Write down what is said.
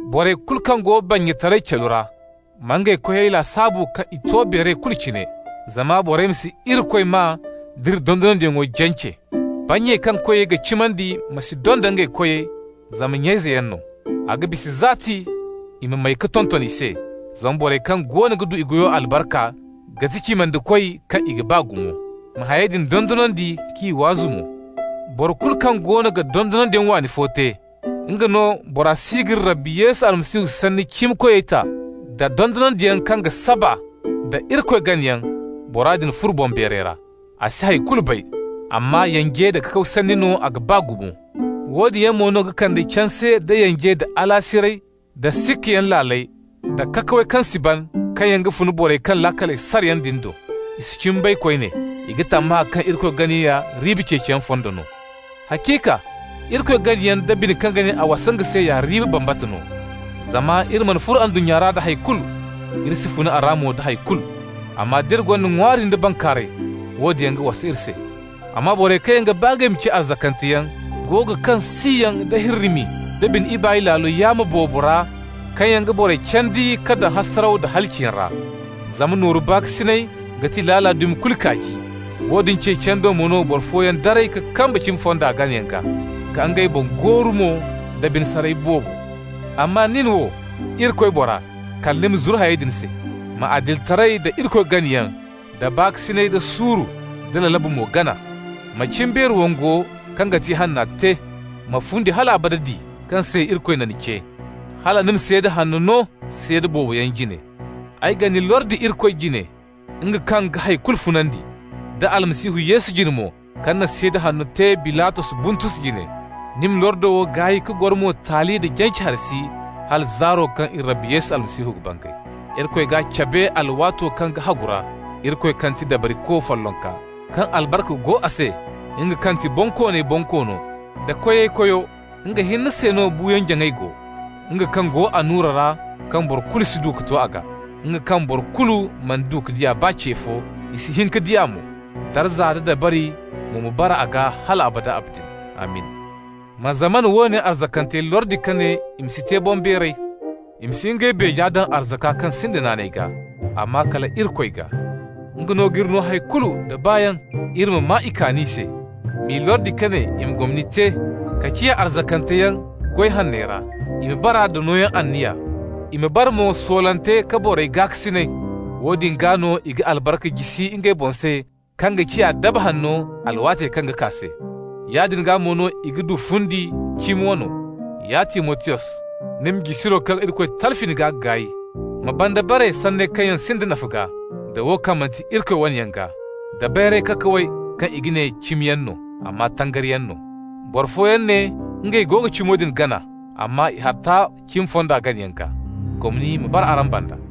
Borey kulu kaŋ go bannyataray calu ra ma ngey koyey lasaabu kaŋ i to beeray kulu cine, zama borey ma si Irikoy maa d'iri dondonandiyaŋo jance. Bannyey kaŋ koyey ga cimandi ma si donda ngey koyey zama nya-izeyaŋ no. A ga bisa zaati i ma may ka tonton i se, zama borey kaŋ goono ga du i goyo albarka ga ti cimandikoy kaŋ i ga baa gumo. Ma hayey din dondonandi k'i waazu mo. Boro kulu kaŋ goono ga dondonandiyaŋ waani fo te, nga no, bora si g'iri Rabbi Yesu Almasihu sanni cimikoyey ta, da dondonandiyaŋo kaŋ ga saba nda Irikoy ganayaŋ, bora din furo boŋbeeray ra. A si hay kulu bay, amma yanje nda kakaw sanni no a ga ba gumo. Woodin yaŋ mo no ga kande canse, da yanje, da alaasiray, da sikkayaŋ laaley, da kakawey kaŋ si ban, kaŋ yaŋ fun borey kaŋ laakaley sara yaŋ do. I si cimi bay koyne. I ga tammahã kaŋ Irikoy ganayaŋ ya riiba ceeciyaŋ fondo no. Haciika, Irikoy ganayaŋ da bine kaŋ ga ne a wasa nga se, ya riiba bambata no. Zama iri mana furo ndunnya ra da hay kulu. Iri si fun a ra mo da hay kulu. Amma d'iri gonda ŋwaari nda bankaaray, woodin yaŋ ga wasa iri se. Amma borey kaŋ ga ba ngey ma ciya arzakanteyaŋ go ga kaŋ siyaŋ da hirrimi da bine ibaay laalo yaamo boobo ra kaŋ yaŋ ga borey candi ka daŋ hasaraw da halaciyaŋ ra. Zama nooru baakasinay ga ti laala dumi kulu kaaji. Woodin ceeciyaŋ do mo no boro fooyaŋ daray ka kamba cimi fonda ganayaŋ gaa, ka ngey boŋ gooru mo da bine saray boobo. Amma nin wo, Irikoy bora, kala ni ma zuru hayey din se. Ma adilitaray, da Irikoy ganayaŋ, da baakasinay, da suuru, da lalabu mo gana. Ma cimbeeri wongo kaŋ ga ti ihanna te. Ma fundi hal abada di, kaŋ se Irikoy na ni ce, hala ni na seeda hanno no seeda boobo yaŋ jine. Ay ga ni lordi Irikoy jine, nga kaŋ ga hay kulu funandi, da Almasihu Yesu jine mo kaŋ na seeda hanno te Bilatos Buntus jine: ni ma lordo wo gaay ka goro mo taali nda jance hari si, hala zaaro kaŋ iri Rabbo Yesu Almasihu ga bangay. Irikoy g'a cabe a alwaato kaŋ ga hagu ra, Irikoy kaŋ ga ti Dabariko follonka, kaŋ albarka go a se, nga kaŋ ga ti bonkooney Bonkoono da koyey Koyo. Nga hinne se no buuyaŋ-jaŋay go, nga kaŋ go annura ra kaŋ boro kulu si du ka to a gaa, nga kaŋ boro kulu mana du ka di a baa ce fo, i si hin ka di a mo. Darza nda dabari mo ma bara a gaa hal abada. Amin! Ma zamana woone arzakantey lordi ka ne i ma si te boŋbeeray. I ma si ngey beeje daŋ arzaka kaŋ sinda naanay gaa, amma kala Irikoy gaa. Nga no g'iri no hay kulu nda baayaŋ, iri ma maa i kaani se. M'i lordi ka ne i ma gomni te, ka ciya arzakanteyaŋ goy hanney ra. I ma bara nda nooyaŋ anniya, i ma bara mo soolante ka borey gaakasinay. Woodin gaa no i ga albarka jisi ngey boŋ se kaŋ ga ciya daba hanno alwaatey kaŋ ga kaa se. Yaadin gaa mo no i ga du fundi, cimi wano. Ya Timotiyos, ni ma jisiro kaŋ Irikoy talfi ni gaa gaay. Ma banda bare sanney kaŋ yaŋ sinda nafa gaa, da wo kaŋ manti Irikoy wane yaŋ gaa, da bayray kakawey kaŋ i ga ne cimiyaŋ no, amma tangari no. Boro fooyaŋ ne ngey go ga cimo din gana, amma i harta cimi fonda ganayaŋ gaa. Gomni ma bara araŋ banda.